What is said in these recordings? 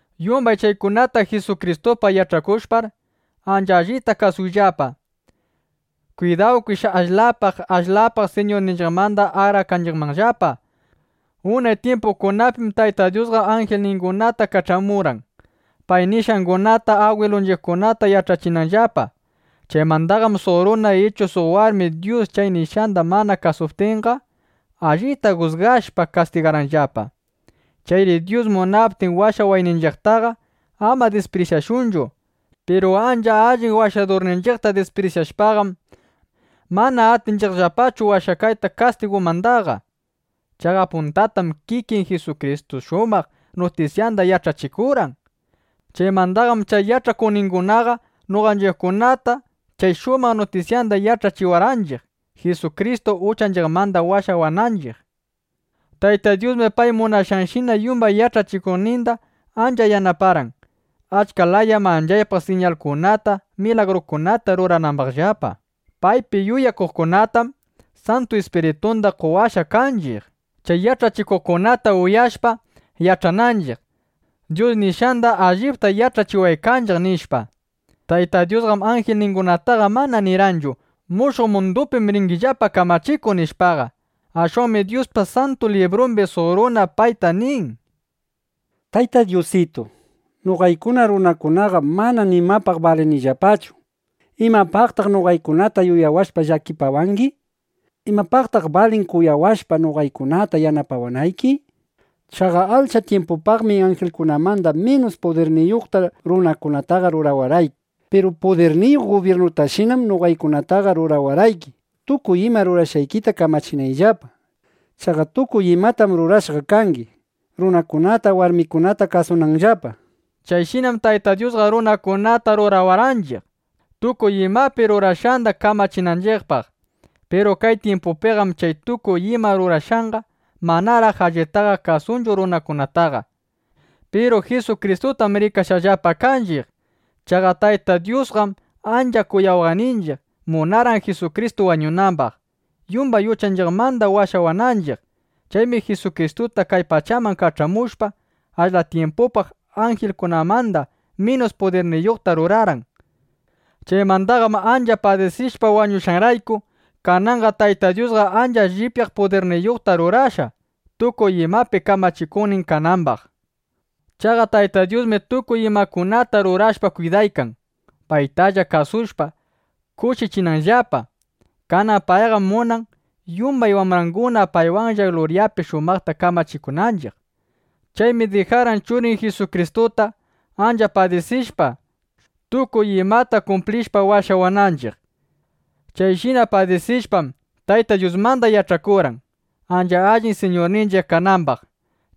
Yumbay chaykunata Jisukristupaq yach'akushpaqar, ancha allita kasushunllapa. Kwidawkish ashlap ashlap Siñurninchiqmanda akrakanchiqmanllapa. Unay tyimpukunapim Tayta Dyusqa anjilningunata kach'amurqan, pay nishqangunata agwilunchiqkunata yach'achinanllapa. Chaymandaqam suq runa ichu suq warmi Dyus chay nishqanda mana kasuptinqa, allita jusgashpa, kastigarqanllapa. Chayri Dyus munaptin washawayninchiqtaqa, ama disprisyashunchu. Piru ancha allin Washadurninchiqta disprisyashpaqam, mana atinchiqllapachu washakayta kastigumandaqa. Chaqa puntatam kikin Jisukristu shumaq nutisyanda yach'achikurqan. Chaymandaqam chay yach'akuqningunaqa noqanchiqkunata chay shumaq nutisyanda yach'achiwarqanchiq, Jisukristu uchanchiqmanda washawananchiq. Tayta Dyusmi pay munashqanshina yumbay yach'achikuqninda ancha yanaparqan, achka laya manchaypaq siñakunata, milagrukunata ruranambaqllapa. Paypi yuyakuqkunatam Santu Ispiritunda qowashqa kanchiq, chay yach'achikuqkunata uyashpa, yach'ananchiq: Dyus nishqandam allipta yach'achiwaykanchiq, nishpa. Tayta Dyusqam anjilningunataqa mana nirqanchu: “Mushuq mundupim ringillapa kamachikuq”, nishpaqa. Ashwanmi Dyuspa Santu Librumbi suq runa payta nin: Tayta Dyusitu, noqaykuna runakunaqam mana nimapaq balinillapachu. ¿Imapaqtaq noqaykunata yuyawashpa llakipawangi? ¿Imapaqtaq balin kuyawashpa, noqaykunata yanapawanayki? Chaqa ashla tyimpupaqmi anjilkunamanda minus pudirniyuqta runakunataqa rurawarqayki. Piru pudirniyuq gubyirnutashinam noqaykunataqa rurawarqayki, tukuy ima rurashqaykita kamachinayllapa. Chaqa tukuy imatam rurashqa kangi, runakunata, warmikunata kasunanllapa, nishpa. Chayshinam Tayta Dyusqa runakunata rurawarqanchiq, tukuy ima rurashqanda kamachinanchiqpaq. Piru kay tyimpupiqam chay tukuy ima rurashqanqa manaraq allitaqa kasunchu runakunataqa. Piru Jisukristutam rikashqallapa kanchiq. Chaqa Tayta Dyusqam ancha kuyawaqninchiq, munarqan Jisukristu wañunambaq, yumbay uchanchiqmanda washawananchiq. Chaymi Jisukristuta kay pachaman kach'amushpa, ashla tyimpupaq anjilkunamanda minus pudirniyuqta rurarqan. Chaymandaqam ancha padisishpa wañushqanrayku, kananqa Tayta Dyusqa ancha llipyaq pudirniyuqta rurashqa, tukuy imapa kamachikuqnin kanambaq. Chaqa Tayta Dyusmi tukuy imakunata rurashpa kwidaykan, paytalla kasushpa, kushichinanllapa. Kanan payqam munan, yumbay wambranguna paywan luryapi shumaqta kamachikunanchiq. Chaymi dijarqan Churin Jisukristuta, ancha padisishpa, tukuy imata kumplishpa, washawananchiq. Chayshina padisishpam, Tayta Dyusmanda yach'akurqan, ancha allin Siñurninchiq kanambaq.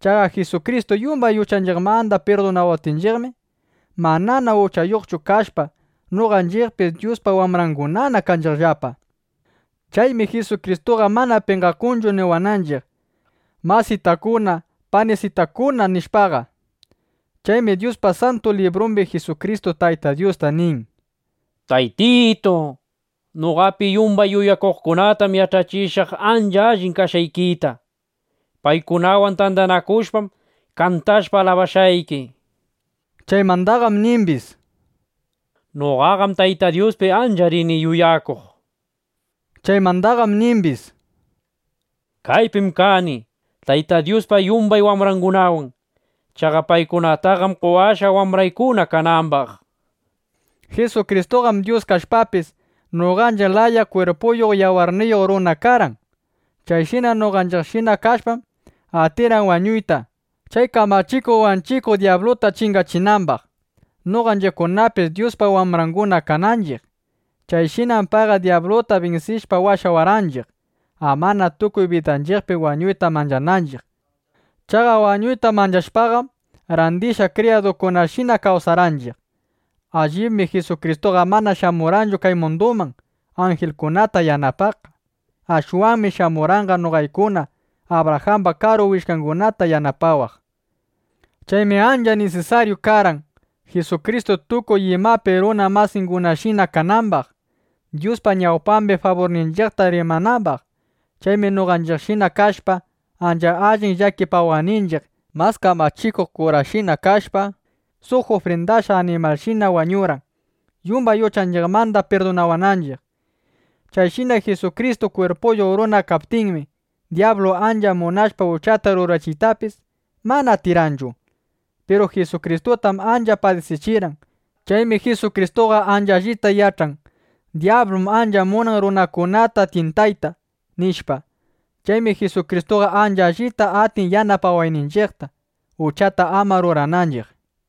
Chaqa Jisukristu yumbay uchanchiqmanda pirdunawaptinchiqmi, manana uchayuqchu kashpa, noqanchiqpis Dyuspa wambrangunana kanchiqllapa. Chaymi Jisukristuqa mana penqakunchu niwananchiq “masitakuna, panisitakuna”, nishpaqa. Chaymi Dyuspa Santu Librumbi Jisukristu Tayta Dyusta nin: Taytitu, noqapi yumbay yuyakuqkunatam yach'achishaq ancha allin kashqaykita. Paykunawan tandanakushpam, kantashpa alabashqayki, nishpa. Chaymandaqam nimbis: Noqaqam Tayta Dyuspi ancha rini yuyakuq, nishpa. Chaymandaqam nimbis: Kaypim kani Tayta Dyuspa yumbay wambrangunawan. Chaqa paykunataqam qowashqa, wambraykuna kanambaq, nishpa. Jisukristuqam Dyus kashpapis, noqanchiq laya kwirpuyuq, yawarniyuq runa karqan. Chayshina noqanchiqshina kashpam, atirqan wañuyta, chay kamachikuq wanchikuq dyabluta chingachinambaq, noqanchiqkunapis Dyuspa wambranguna kananchiq. Chayshinam payqa dyabluta binsishpa washawarqanchiq, amana tukuy bidanchiqpi wañuyta manchananchiq. Chaqa wañuyta manchashpaqam, randishqa kriyadukunashina kawsarqanchiq. Allibmi Jisukristuqa mana shamurqanchu kay munduman, anjilkunata yanapaqqa. Ashwanmi shamurqanqa noqaykuna Abrajamba karu willkangunata yanapawaq. Chaymi ancha nisisaryu karqan, Jisukristu tukuy imapi runa masingunashina kanambaq, Dyuspa ñawpambi faburninchiqta rimanambaq. Chaymi noqanchiqshina kashpa, ancha allin llakipawaqninchiq mas kamachikuq kurashina kashpa, suq ufrindashqa animalshina wañurqan, yumbay uchanchiqmanda pirdunawananchiq. Chayshina Jisukristu kwirpuyuq runa kaptinmi, dyablu ancha munashpa uchata rurachiytapis, mana atirqanchu. Piru Jisukristutam ancha padisichirqan. Chaymi Jisukristuqa ancha allita yach'an: Dyablum ancha munan runakunata tyintayta, nishpa. Chaymi Jisukristuqa ancha allita atin yanapawayninchiqta, uchata ama rurananchiq.